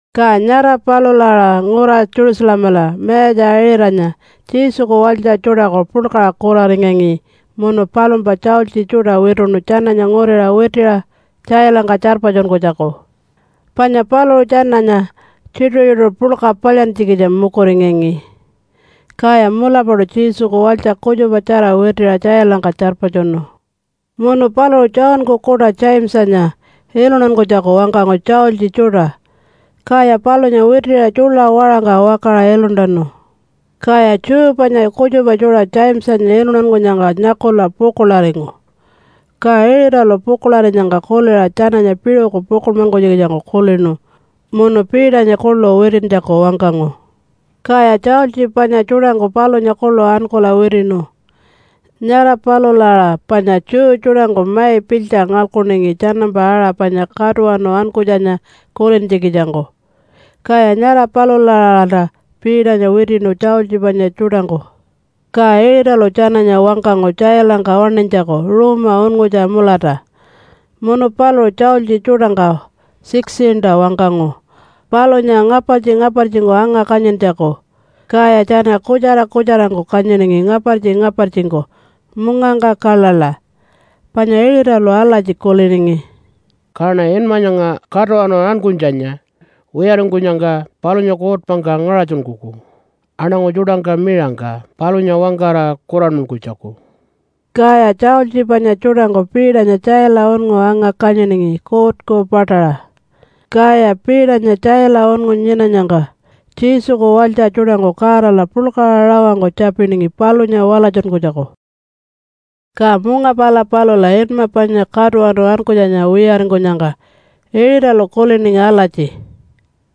Ka nyara palula aṟa ngura Jerusalemala mayatja Iṟatanya Jesuku walytja tjuṯaku puḻkaṟa kuraringangi munu palumpa tjaultji tjuṯa wituṉu tjananya nguriṟa witiṟa tjailangka tjarpatjunkunytjaku, panya paluṟu tjananya tjituṟu-tjituṟu puḻka palyantjikitja mukuringangi. Kaya mulapaṯu Jesuku walytja kutjupatjara witiṟa tjailangka tjarpatjunu. Munu paluṟu Johnku kuṯa Jamesanya iluntankunytjaku wangkangu tjaultji tjuṯa, kaya palunya witiṟa tjuḻa waṟangka wakaṟa iluntanu. Kaya Jew panya kutjupa tjuṯa Jamesanya iluntankunyangka nyakula pukuḻaringu. Ka Iṟatalu pukuḻarinyangka kuliṟa tjananya piṟuku pukuḻmankunytjikitjangku kulinu munu Peternya kuḻu witintjaku wangkangu. Kaya tjaultji panya tjuṯangku palunya kuḻu ankula witiṉu. Nyara palula aṟa panya Jew tjuṯangku mai pilytja ngalkuningi tjanampa aṟa panya Katuwanu Ankunytjanya kulintjikitjangku, kaya nyara palula-aṟalta Peternya witiṉu tjaultji panya tjuṯangku. Ka Iṟatalu tjananya wangkangu tjailangka waṉinytjaku ruuma unngutja mulata munu paluṟu tjaultji tjuṯangka 16-ta wangkangu palunya ngapartji-ngapartjingku anga-kanyintjaku. Kaya tjana kutjara kutjarangku kanyiningi ngapartji-ngapartjingku mungangka kaḻaḻa. Panya Iṟatalu alatji kuliningi, “Kaṉa inma nyanga ‘Katuwanu Ankunytjanya’ wiyaringkunyangka palunya kuutpangka ngaṟatjunkuku aṉangu tjuṯangka miṟangka palunya wangkara kuranmankunytjaku.” Kaya tjaultji panya tjuṯangku Peternya tjaila unngu anga-kanyiningi kuutku paṯaṟa. Kaya Peternya tjaila unngu nyinanyangka Jesuku walytja tjuṯangku Godala puḻkaṟa rawangku tjapiningi palunya walatjunkunytjaku. Ka munga pala palula inma panya Katuwanu Ankunytjanya wiyaringkunyangka Iṟatalu kuliningi alatji,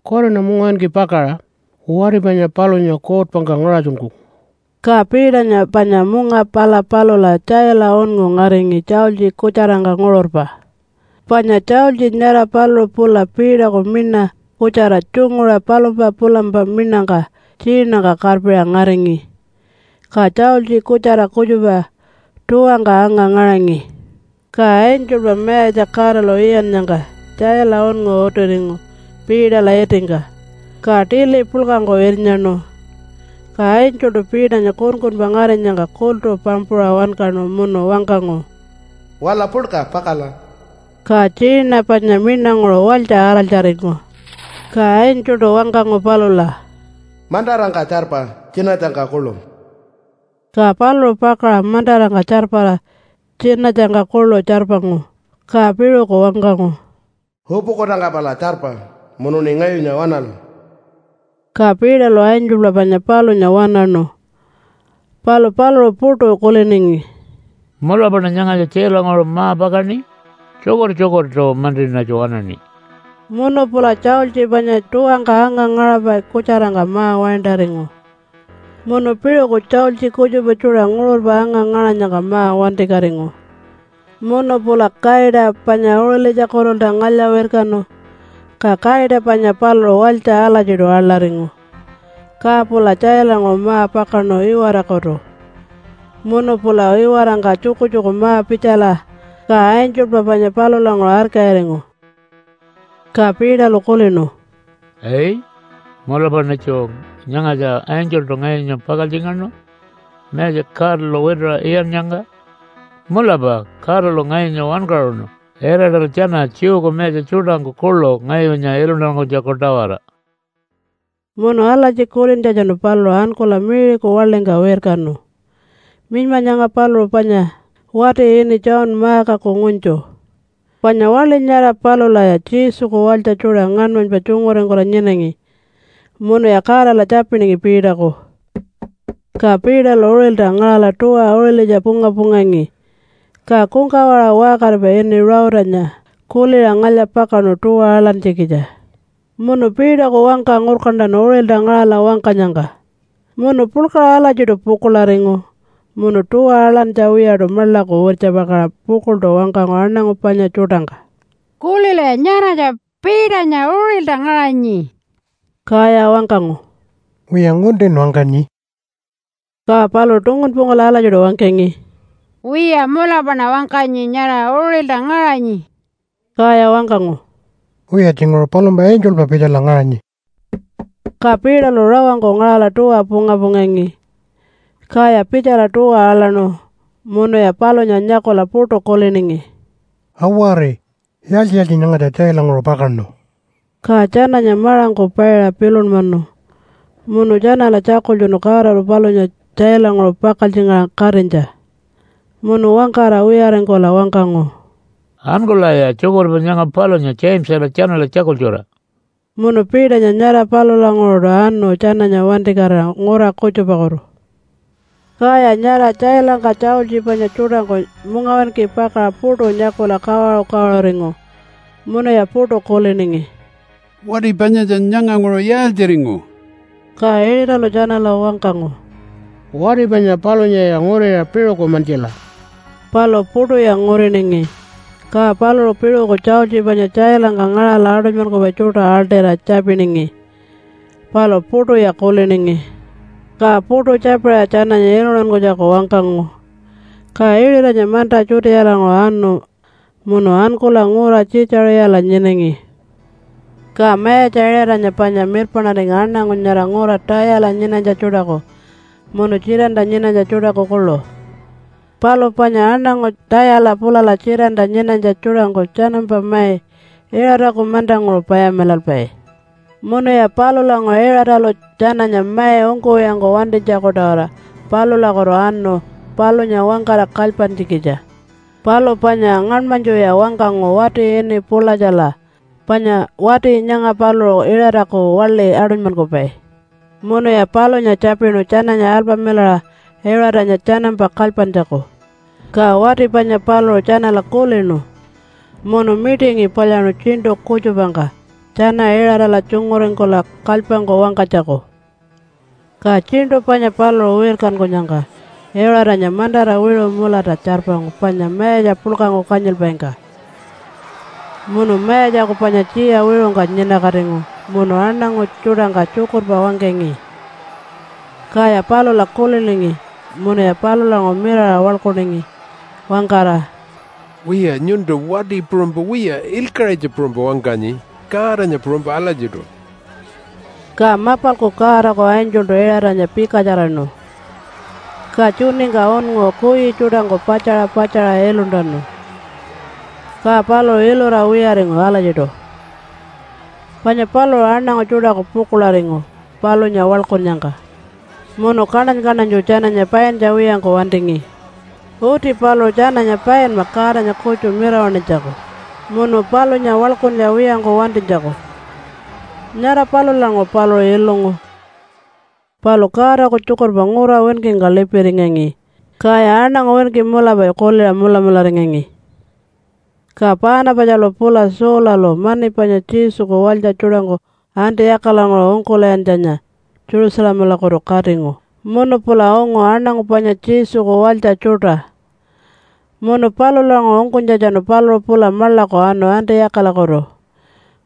“Kuwariṉa mungawinki pakaṟa wati panya palunya kuutpangka ngaṟatjunkuku.” Ka Peternya panya munga pala palula tjaila unngu ngaringi tjaultji kutjarangka nguṟurpa, panya tjaultji nyara paluṟu pula Peterku miṉa kutjara tjunguṟa palumpa pulampa miṉangka tjiinangka karpiṟa ngaringi, ka tjaultji kutjara kutjupa tuwangka anga-ngaṟangi. Ka angelpa Mayatja Godalu iyannyangka tjaila unngu utiringu Peterla itingka, ka tili puḻkangku irnyaṉu. Ka angeltu Peternya kunkunpa ngarinyangka kultu pampuṟa wankaṉu munu wangkangu, “Waḻa puḻka pakala!” Ka tjiina panya miṉanguṟu walytja araltjaringu. Ka angeltu wangkangu palula, “Mantarangka tjarpa tjinatjangka kuḻu!” Ka paluṟu pakaṟa mantarangka tjarpara tjinatjangka kuḻu tjarpangu. Ka piṟuku wangkangu, “Upukutangka pala tjarpa munuṉi ngayunya waṉala!” Ka Peterlu angelpa panya palunya waṉaṉu, palu paluṟu puṯu kuliningi, “Mulapaṉa nyangatja tjailanguṟu ma-pakaṉi? Tjukur-tjukurtu-mantiṉatju waṉaṉi.” Munu pula tjaultji panya tuwangka anga-ngaṟapai kutjarangka ma-waintaringu, munu piṟuku tjaultji kutjupa tjuṯa nguṟurpa anga-ngaṟanyangka ma-wantikatingu, munu pula kaita panya uṟilitjakutulta ngalya-wirkanu. Ka kaita panya paluṟu walytja alatjiṯu aḻaringu, ka pula tjailanguṟu ma-pakaṉu iwarakutu, munu pula iwarangka tjukutjuku ma-pitjala, ka angelpa panya palulanguṟu arkayiringu. Ka Peterlu kulinu, “Ai! Mulapaṉitju nyangatja angeltu ngayunya pakaltjingaṉu Mayatja Godalu wituṟa iyannyangka? Mulapa Godalu ngayunya wankaṟunu Iṟatalu tjana Jewku mayatja tjuṯangku kuḻu ngayunya iluntankunytjaku-tawara.” Munu alatji kulintjatjanu paluṟu ankula Mary-ku waḻingka wirkanu. Minyma nyanga paluṟu panya wati ini John Markaku ngunytju, panya waḻi nyara palulaya Jesuku walytja tjuṯa ngaṉmanypa tjunguringkula nyinangi munuya Godala tjapiningi Peterku. Ka Peterlu uṟilta ngaṟala tuwa uṟilitja punga-pungangi, ka kungkawaṟa waṟkaripai ini Ruutanya kuliṟa ngalya-pakaṉu tuwa aḻantjikitja. Munu Peterku wangka ngurkantanu uṟilta ngaṟala wangkanyangka munu puḻkaṟa alatjiṯu pukuḻaringu. Munu tuwa aḻantja wiyaṯu maḻaku wirtjapakaṟa pukuḻṯu wangkangu aṉangu panya tjuṯangka, “Kulilaya! Nyaratja Peternya uṟilta ngaṟanyi.” Kaya wangkangu, “Wiya, nguntin wangkanyi.” Ka paluṟu tungunpungkula alatjiṯu wangkangi, “Wiya, mulapaṉa wangkanyi. Nyara uṟilta ngaṟanyi.” Kaya wangkangu, “Wiya, tjinguṟu palumpa angelpa pitjala ngaṟanyi.” Ka Peterlu rawangku ngaṟala tuwa punga-pungangi, kaya pitjala tuwa aḻaṉu munuya palunya nyakula puṯu kuliningi, “Awari! Yaaltji-yaaltji nyangatja tjailanguṟu pakaṉu?” Ka tjananya maṟangku paiṟa pilunmanu munu tjanala tjakultjunu Godalu palunya tjailanguṟu pakaltjingaṟa katinytja. Munu wangkara wiyaringkula wangkangu, “Ankulaya tjukurpa nyanga palunya Jamesala tjanala tjakultjura!” Munu Peternya nyara palulanguṟuṯu anu tjananya wantikatira ngura kutjupakutu. Kaya nyara tjailangka tjaultji panya tjuṯangku mungawinki pakaṟa puṯu nyakula kawaṟu-kawaṟuringu, munuya puṯu kuliningi, “Wati panyatja nyanganguṟu yaaltjiringu?” Ka Iṟatalu tjanala wangkangu, “Wati panya palunyaya nguriṟa piṟuku mantjila!” Palu puṯuya nguriningi. Ka paluṟu piṟuku tjaultji panya tjailangka ngaṟala aṯunymankupai tjuṯa aḻṯira tjapiningi, palu puṯuya kuliningi. Ka puṯu tjapiṟa tjananya iluntankunytjaku wangkangu. Ka Iṟatanya manta Judealanguṟu anu munu ankula ngura Tjiitjaṟiyala nyinangi. Ka Mayatja Iṟatanya panya mirpaṉaringi aṉangu nyara ngura Tayala nyinanytja tjuṯaku munu Tjitanta nyinanytja tjuṯaku kuḻu. Palu panya aṉangu Tayala pulala Tjitanta nyinanytja tjuṯangku tjanampa mai Iṟataku mantanguṟu payamilalpai. Munuya palulanguṟu Iṟatalu tjananya mai ungkuwiyangku wantinytjaku-tawara palulakutu anu palunya wangkara kalypantjikitja. Palu panya ngaṉmanytjuya wangkangu wati ini Pulatjala, panya wati nyanga paluṟu Iṟataku waḻi aṯunymankupai. Munuya palunya tjapinu tjananya alpamilaṟa Iṟatanya tjanampa kalypantjaku. Ka wati panya paluṟu tjanala kulinu munu mitingi palyaṉu tjiṉṯu kutjupangka tjana Iṟatala tjunguringkula kalypangku wangkanytjaku. Ka tjiṉṯu panya paluṟu wirkankunyangka Iṟatanya mantara wiṟu mulata tjarpangu panya mayatja puḻkangku kanyilpaingka, munu mayatjaku panya tjiya wiṟungka nyinakatingu munu aṉangu tjuṯangka tjukurpa wangkangi. Kaya palula kuliningi munuya palulanguṟu mirara waḻkuningi wangkara, “Wiya, nyuntu wati puṟunypa wiya, ilkaṟitja puṟunypa wangkanyi, Godanya puṟunypa alatjiṯu.” Ka mapalku Godaku angeltu Iṟatanya pikatjaraṉu, ka tjuningka unngu kuyi tjuṯangku patjaṟa patjaṟa iluntanu. Ka paluṟu ilura wiyaringu alatjiṯu, panya paluṟu aṉangu tjuṯaku pukuḻaringu palunya waḻkunnyangka munu kaṉany-kaṉanytju tjananya paintja wiyangku wantingi. Uti paluṟu tjananya painma Godanya kutju mirawaṉinytjaku, munu palunya waḻkuntja wiyangku wantinytjaku. Nyara palulanguṟu paluṟu ilungu. Palu Godaku tjukurpa ngura winkingka lipiringangi, kaya aṉangu winki mulapa kuliṟa mulamularingangi. Ka Paanapatjalu pula Saulalu mani panya Jesuku walytja tjuṯangku Antiyakalanguṟu ungkul'iyantjanya Jerusalemalakutu katingu munu pula ungu aṉangu panya Jesuku walytja tjuṯa. Munu palulanguṟu ungkunytjatjanu paluṟu pula maḻaku anu Antiyakalakutu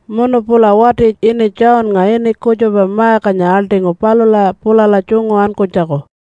munu pula wati ini Johnnga ini kutjupa Markanya aḻṯingu palula pulala tjungu ankunytjaku.